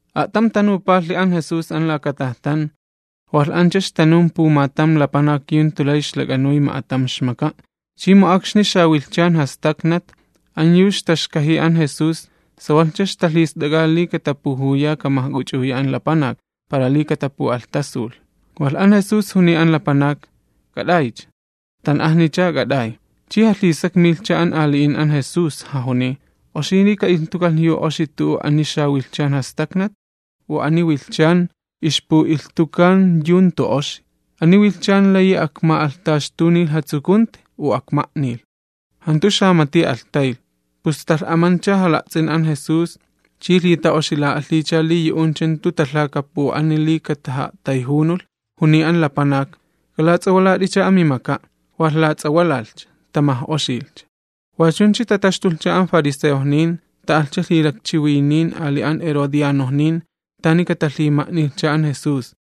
A'tam tanupalhi an Jesús an tan ixtata'ayxt'o'a an lapanakni, walh ancha ixtanun pumatam lapanak yu jantu lay ixlak'anuy ma'atam ixmaka'. Chi mu akxni jantu ixtapatsakan wilhchan, an yu ixtaxkajiy an Jesús sawalhcha ixtalhist'ak'a li katapujuya kamajk'uch'uya an lapanak, para li katapu'alhtasulh. Walh an Jesús juniy an lapanak: ―K'at'aycha, tan'ajnich'a k'at'ay. Chi jalhisakmilhcha an ali'in an Jesús, jajuniy: ―¿Oxi li ka'ilhtukalh yu oxi tu'u akxni jantu tapatsakan wilhchan? ¿U ani wilhchan ixpu'ilhtuka yu jantu oxi? ¿Ani wilhchan layi akma'alhtaxtunilh jatsukunti, u akma'nilh? Jantu xamati alhtaylh. Pus talh'amancha jala'ts'in an Jesús chi lhita'oxila'alhiycha li yu'uncha jantu talhakapu'ani li kataja'a'tayjunulh, juniy an lapanak: ―K'alats'awalat'icha amimaka'. Walh lats'awalalhcha, tamaj'oxilhcha. Wachuncha tataxtulhcha an fariseojnin ta'alhcha lhilakchiwinin ali an herodianojnin tani katalhima'nilhcha an Jesús.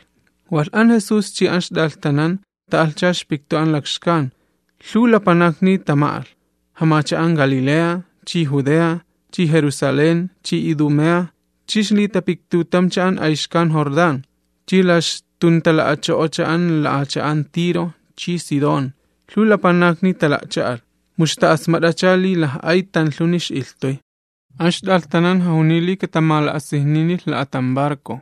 Walh an Jesús chi an ixt'alhtanan ta'alhcha ixpiktu an lakxkan, lhuw lapanakni tama'alh. Jamacha'an Galilea, chi Judea, chi Jerusalén, chi Idumea, chi ixlitapiktutamcha an ayxkan Jordán, chi la ixtuntala'acho'ocha an la'acha'an Tiro, chi Sidón, lhuw lapanakni tala'cha'alh, mu ixta'asmat'acha li laj'ay tanlhuni ix'ilhtuy. An ixt'alhtanan jajuniy li katamala'asijninilh la'atam barco,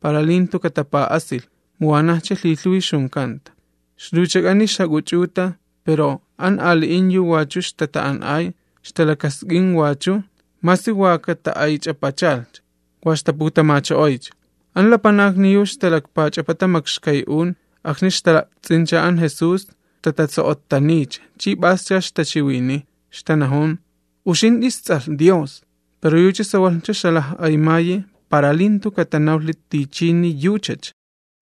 para li jantu katapa'asilh, mu wanajcha lhilhuwi ixjunkanta. Ixluwchak'ani ixjak'uch'uta pero an ali'in yu wachu ixtata'an'ay ixtalakask'in wachu masi wa kaxta'aych'apachalhcha, wa ixtaputamacho'oycha. An lapanakni yu ixtalakpach'apata makxkay'un akxni ixtala'ts'incha an Jesús ixtata'a'tso'ottaniycha chi p'ascha ixtachiwiniy, ixtanajun: ―Uxint'i isTs'alh Dios. Pero yucha sawalhcha ixjalaj'aymayi para li jantu katanawlhi tichini yuchacha.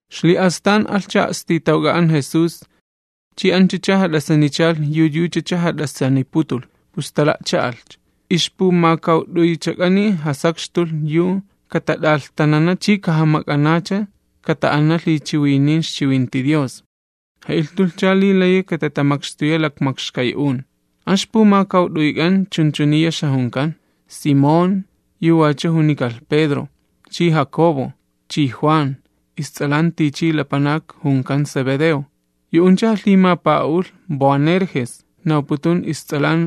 Xli'astan alhcha a'stitawk'a an Jesús, chi anchacha jat'asanichalh yu yuchacha jat'asaniputulh, pus tala'cha'alhcha. Ixpumakawt'uychak'ani jasakxtulh yu katat'alhtanana chi kajamak'anacha kata'ana lhichiwinin ixchiwinti Dios. Ja'ilhtulhcha li layi katatamakxtuya lakmakxkay'un: An ixpumakawt'uyk'an chunchuniya ixjajunkan: Simón, yu wachu junikalh Pedro, chi Jacobo, chi Juan, ists'alan tichi lapanak junkan Zebedeo, yu'uncha jalhimapa'a'ulh Boanerges, nawputun ists'alan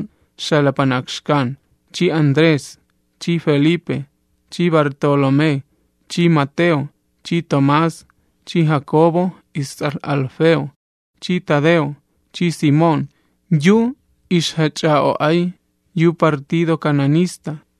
xalapanak xkan, chi Andrés, chi Felipe, chi Bartolomé, chi Mateo, chi Tomás, chi Jacobo, ists'alh Alfeo, chi Tadeo, chi Simón yu ma'partido Cananista,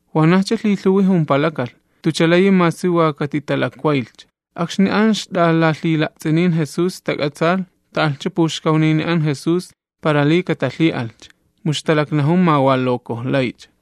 Wanajcha lhilhuwi jumpalakalh, jantucha layi masi wa katitalakwaylhcha. Akxni an ixt'alalhila'ts'inin Jesús tak'atsaalh, ta'alhcha puxkawnini an Jesús para li katalhi'alhcha, mu ixtalaknajun ma wa lokojlaycha.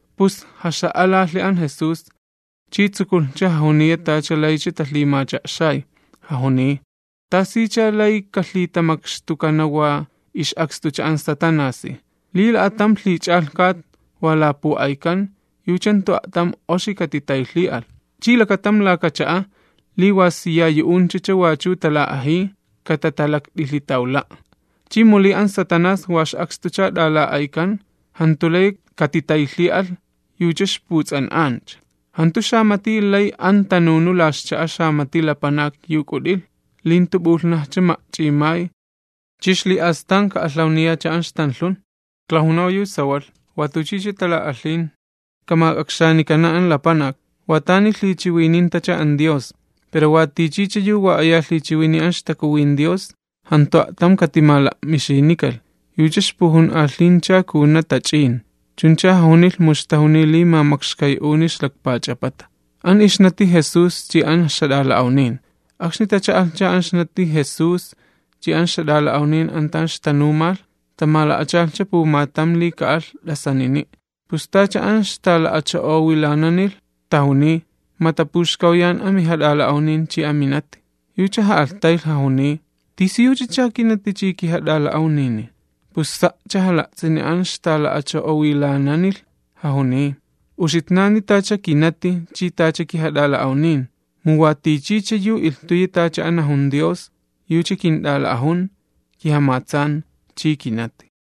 Pus jaxa'alalhi an Jesús, chi tsukulhcha jajuniya tacha laycha talhimacha'xay, jajuniy: ―¿Tasicha lay kalhitamakxtukana wa ix'akstucha an Satanasi? Li la'atam lhich'alhkat wa lapu'aykan, yucha jantu a'tam oxi katitaylhi'alh, chi lakatam laka cha'a, li wa siya yu'unchacha wachu tala'ajiy, katatalakt'ilhitawla'. Chi mu li an Satanás wa ix'akstucha t'ala'aykan, jantu layi katitaylhi'alh, yucha ixputs'an'ancha. Jantu xamati lay an tanunu la ixcha'a xamati lapanak yu k'ut'ilh, li jantu p'ulhnajcha ma'ch'imay chi xli'astan ka'alhawniyacha an ixtanlhun. Klajunaw yu sawalh, watuchicha tala'alhin kamak'akxanikana an lapanak, wa tani lhichiwinintacha an Dios. Pero watichicha yu wa aya lhichiwiniy an ixTakuwin Dios, jantu a'tam katimala'mixinikalh, yucha ixpujun'alhincha kajuna tach'in. Chuncha jajunilh mu ixtajuniy li ma makxkay'uni ixlakpach'apata. Akxni tacha'alhcha an ixnati Jesús chi an ixjat'ala'awnin an tan ixtanumalh, tamala'achalhcha pumatam li ka'alh t'asanini'. Pus tacha an ixtala'acho'owilananilh, tajuniy: ―Ma tapuxkawyan an mijat'ala'awnin chi an minati. Yucha ja'alhtaylh jajuniy: ―¿Tisiyuchacha kinati chi kijat'ala'awnini? Pus sa'cha jala'ts'ini an ixtala'acho'owilananilh, jajuniy: ―Uxitnani tacha kinati chi tacha kijat'ala'awnin, mu wa tichicha yu ilhtuyi tacha an najun Dios, yucha kint'ala'ajun, kijamatsan chi kinati.